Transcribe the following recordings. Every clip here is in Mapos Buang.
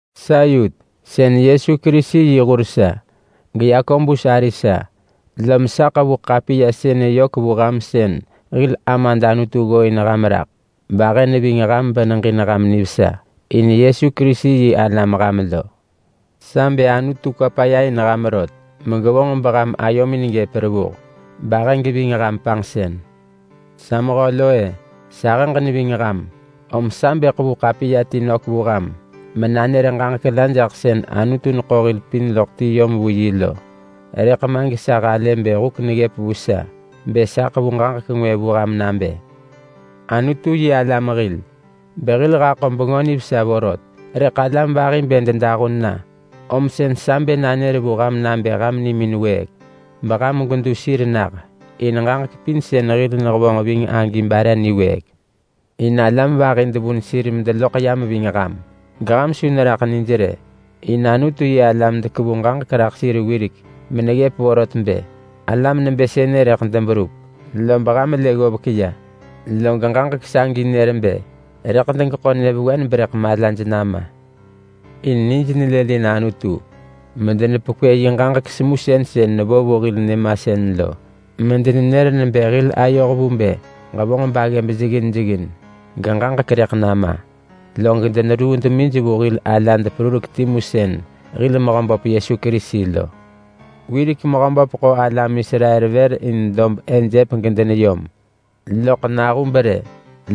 Sa Yut, sën Yesu Kerisi yi hur sa, geYakobus ari sa. Lom sa ḳevu ḳapiya sënë yök vu ham sën hil Amad Anutu ggooin ham raḳ bahë neving ham beneġin ham nivesa in Yesu Kerisi yi alam ham lo. Sa bë Anutu kwa paya in ham rot megevonġ beham ayomin gëp revuh, bahë geving ham panġsën. Sa mehö lo-e, sahëġ neving ham, om sa bë ḳevu ḳapiya ti nök vu ham menanër ġaġek la jaḳ sën Anutu neḳo hil pin loḳ ti yom vu yi lo. Rëḳ ma gesa halë bë huk neggëp vu sa bë sa ḳevu ġaġek ngwë vu ham nabë: Anutu-yi-alam hil, behil haḳo Bengö Nivesa vorot. Rëḳ alam vahi bë dedahun na, om sën sa bë nanër vu ham nabë ham nimin wëëk, beham gwedu sir nah, in ġaġek pin sën hil nehevonġ ving agi bare niwëëk. In alam vahi devun sir medeloḳ yam ving ham geham su neraḳ nij rë. In Anutu-yi-alam dekevu ġaġek raḳ sir wirek meneggëp vorot bë alam nebë sënë rëḳ deberup, beham lë ggovek ya. Log ġaġek sagi nër bë rëḳ degeḳo nyëvewen berëḳ malaj nama. In nij nelëlin Anutu medenepekwë yi ġaġek semusën sën nevo vu hil nyëmasën lo, medenenër nebë hil ayoh vu bë ġevonġ baggëb jeggin jeggin, geġaġek rëḳ nama. Log deneruu demij vu hil alad perurek timu sën hil Mehöböp Yesu Kerisi lo. Wirek Mehöböp ḳo alam Israel vër in dob Ejep gedeneyom, loḳ nahub rë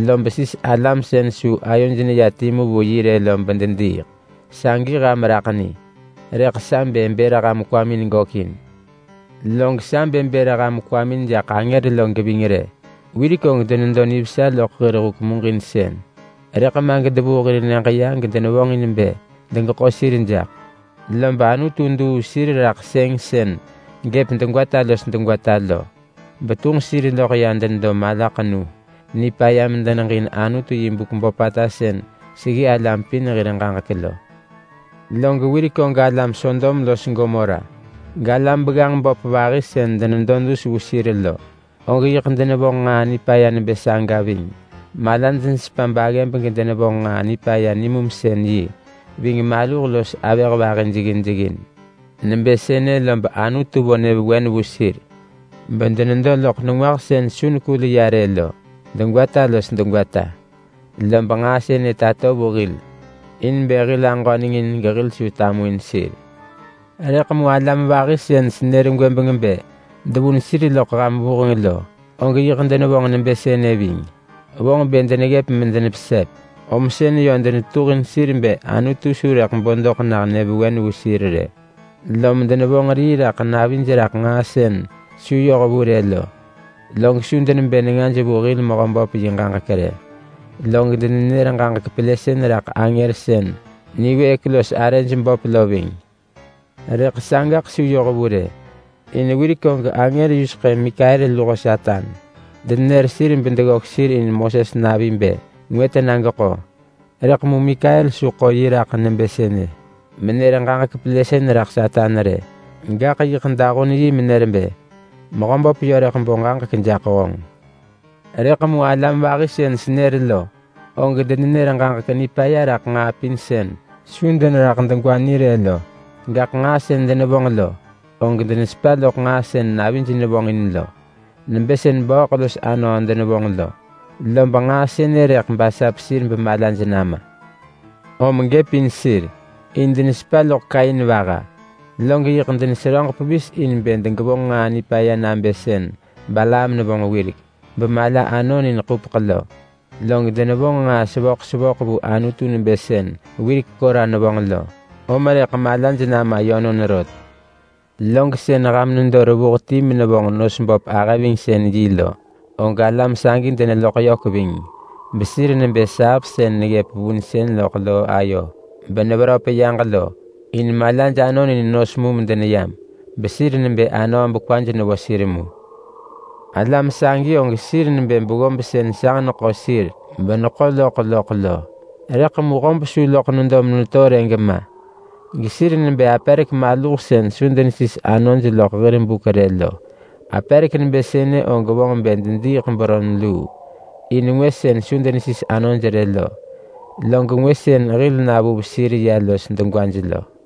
lob sis alam sën su ayoj neya timu vu yi rë lo bedediiḳ. Sagi ham raḳ ni, rëḳ sa bë bër ham kwamin gökin. Log sa bë bër ham kwamin jaḳ angër lo geving rë. Wirek og denedo nivesa loḳ hir huk muġinsën, rëḳ ma gedevuu hir nyëġ ya gedevonġin bë degeḳo sir jaḳ. Lob Anutu duu sir raḳ sëng sën gëp degwata los degwata lo, betunġ sir loḳ ya denedo malaḳenu nipaya medeneġin Anutu yi buk böpata sën seggi alam pin hir ġaġek lo. Log wirek og alam Sodom los Gomora, galam begganġ böp vahi sën denedo dus vu sir lo, og yiḳ denevonġ nġaa nipaya nebë saga ving. Malaj nesepa baggëb gedenevonġ nġaa nipaya nimumsën-yi ving maluh los avëh vahi jeggin jeggin. Nebë sënë lob Anutu vo nyëvewen vu sir bedenedo loḳ nengwah sën su nekul ya rë lo degwata los degwata. Lob nġaa sënë tato vu hil in bë hil aġöneng in gehil su tamuin sir. Rëḳ mu alam vahi sën senër gwëbeng bë devun sir loḳ ham vuheng lo, og yiḳ denevonġ nebë sënë ving. Vonġ bë deneggëp medenepesep, om sën yö denetetuhin sir bë Anutu su rëḳ bo doḳ nah nyëvewen vu sir rë, lom denevonġ rii raḳ navij raḳ nġaa sën su yoh vu rë lo. Log su denebë nengaj vu hil Mehöböp yi ġaġek rë, log denenër ġaġek pelësën raḳ angër sën niwëëk los arëj böp lo ving. Rëḳ sagaḳ su yoh vu rë. In wirek og angër yuseḳë Mikael luho Satan denenër sir bedeggök sir in Moses navi bë ngwë tena geḳo. Rëḳ mu Mikael su ḳo yi raḳ nebë sënë menër ġaġek pelësën raḳ Satan rë, gaḳ yiḳ dahun yi menër bë, “Mehöböp yö rëḳ bo ġaġek jaḳ honġ!” Rëḳ mu alam vahi sën senër lo, og denenër ġaġek nipaya raḳ nġaa pin sën su deneraḳ degwa ni rë lo. Gaḳ nġaa sën denevonġ lo, og denesepa loḳ nġaa sën navij nevonġin lo nebë sën bööḳ los anöö denevonġ lo, lob nġaa sënë rëḳ basap sir bemalaj nama. Om gëp in sir, in denesepa loḳ Kain vaha, log yiḳ deneseröġ pevis in bë degevonġ nġaa nipaya nabë sën Balaam nevonġ wirek bemala anon in ḳupeḳ lo. Log denevonġ nġaa sevöḳ sevöḳ vu Anutu nebë sën wirek Kora nevonġ lo, om rëḳ malaj nama yönon rot. Log sën ham nedo revuh ti menevonġ nos böp ahëvingsën-yi lo, og alam sagi deneluḳ yök ving besir nebë saap sën neggëp vunsën loḳ loo ayo beneveröp yaġ lo. In malaj anon in nos mu medeneyam, besir nebë anöö bekwaj nevo sir mu. Alam sagi og sir nebë beggob sën sanġ neḳo sir beneḳo loḳ loḳ lo, rëḳ mu hob su loḳ nedo meneto rë gema. Gesir nebë aperek maluh sën su denesis anoj loḳ hir buk rë lo. Aperek nebë sënë og vonġ bë dediiḳ beron luu, in ngwë sën su denesis anoj rë lo, log ngwë sën hil navuv sir ya los degwaj lo.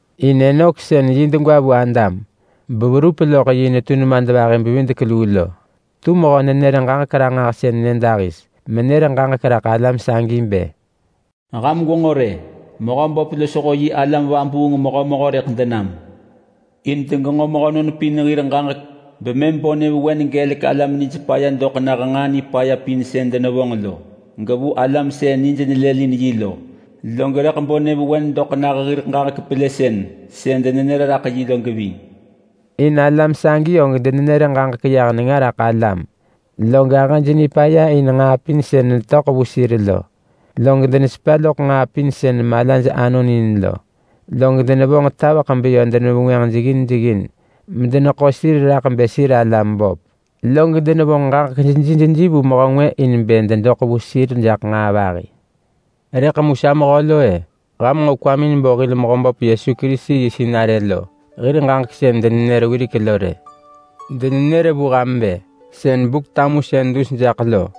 In Enok sën yi degwa vu Adam beverup yi netu nemadvahi-bevidek-luu lo tu mehö-nenër-ġaġek-ranġahsën nyëdahis menër ġaġek raḳ alam sagi bë, “Ham gwenġo rë! Mehöböp losho yi alam vabuung mehömehö rëḳ denam in degenġo mehönon pin hir ġaġek bemëm bo nyëvewen gelek alam nij paya doḳ nah nġaa nipaya pin sën denevonġ lo, gevu alam sën nij nelëlin yi lo. Log rëḳ bo nyëvewen doḳ nah hir ġaġek pelësën sën denenër raḳ yi lo geving.” In alam sagi og denenër ġaġek yah nenga raḳ alam, log ahëj nipaya in nġaa pin sën netöḳ vu sir lo. Log denesepa loḳ nġaa pin sën malaj anon in lo. Log denevonġ taveḳ beyö denevengwënġ jeggin jeggin medeneḳo sir raḳ bë sir alam böp. Log denevonġ ġaġek jeji jeji vu mehö ngwë in bë dedoḳ vu sir jaḳ nġaa vahi. Rëḳ mu sa mehö lo-e. Ham nġo kwamin bo hil Mehöböp Yesu Kerisi yi sinarë lo hir ġaġek sën denenër wirek lo rë. Denenër bë, “Doḳ sën nabë Buk-tamusën dus jaḳ lo,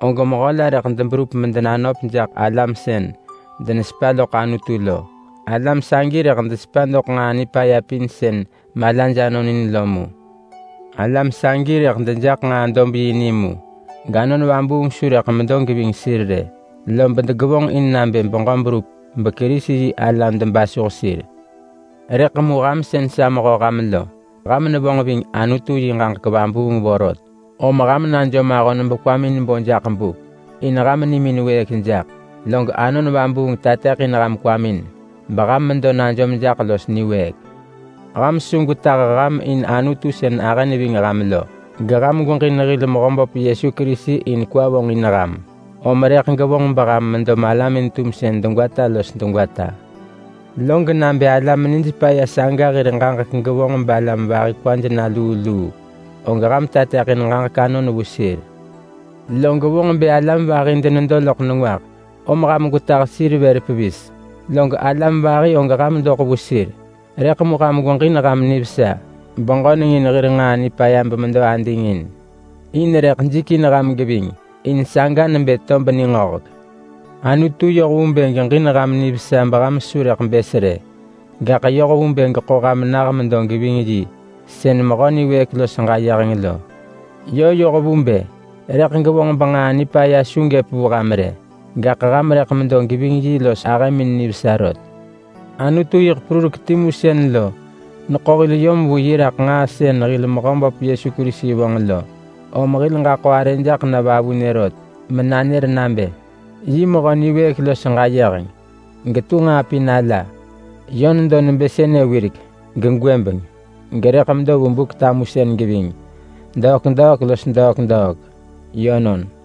og mehö la rëḳ deberup medenanöp jaḳ alam sën denesepa loḳ Anutu lo. Alam sagi rëḳ desepa doḳ nġaa nipaya pin sën malaj anon in lo mu.” Alam sagi rëḳ dejaḳ nġaa-dob-yi ni mu, gAnon Vabuung su rëḳ medo geving sir rë, lob degevonġ in nabë beġö berup beKerisi-yi-alam debasuh sir. Rëḳ mu ham sën sa mehö ham lo, ham nevonġ ving Anutu yi ġaġek vabuung vorot. Om ham najom ahon bekwamin bo jaḳ buk in ham nimin wëëk jaḳ. Log Anon Vabuung tateḳin ham kwamin beham medo najom jaḳ los niwëëk. Ham su gwetah ham in Anutu sën ahë neving ham lo. Geham gweġin hil Mehöböp Yesu Kerisi in kwa vonġin ham, om rëḳ gevonġ beham medo malamin-tumsën degwata los degwata. Log nabë alam nij paya saga hir ġaġek gevonġ balam vahi kwaj na luu luu, og ham tateḳin ġaġek anon vu sir. Log vonġ bë alam vahi denedo loḳ nengwah, om ham gwetah sir vër pevis. Log alam vahi og ham doḳ vu sir. Rëḳ mu ham gweġin ham nivesa beġöneng in hir nġaa nipaya bemedo ading in. In rëḳ jikin ham geving, in saga nebë tob ningöhek. Anutu yoh vu bë geġin ham nivesa beham su rëḳ bës rë, gaḳ yoh vu bë geḳo ham nah medo geving yi sën mehö niwëëk los ġayeheng lo. Yö yoh vu bë rëḳ gevonġ benġaa nipaya su gëp vu ham rë, gaḳ ham rëḳ medo geving yi los ahëmin nivesa rot. Anutu yiḳ perurek timu sën lo neḳo hil yom vu yi raḳ nġaa sën hil Mehöböp Yesu Kerisi vonġ lo, om hil ġaḳo arë jaḳ na vavunë rot menanër nabë yi Mehö niwëëk los ġayeheng, getu nġaa pin ala. Yö nedo nebë sënë wirek, gegwëbeng, gerëḳ medo vu Buk-tamusën geving, degwata los degwata. Yönon.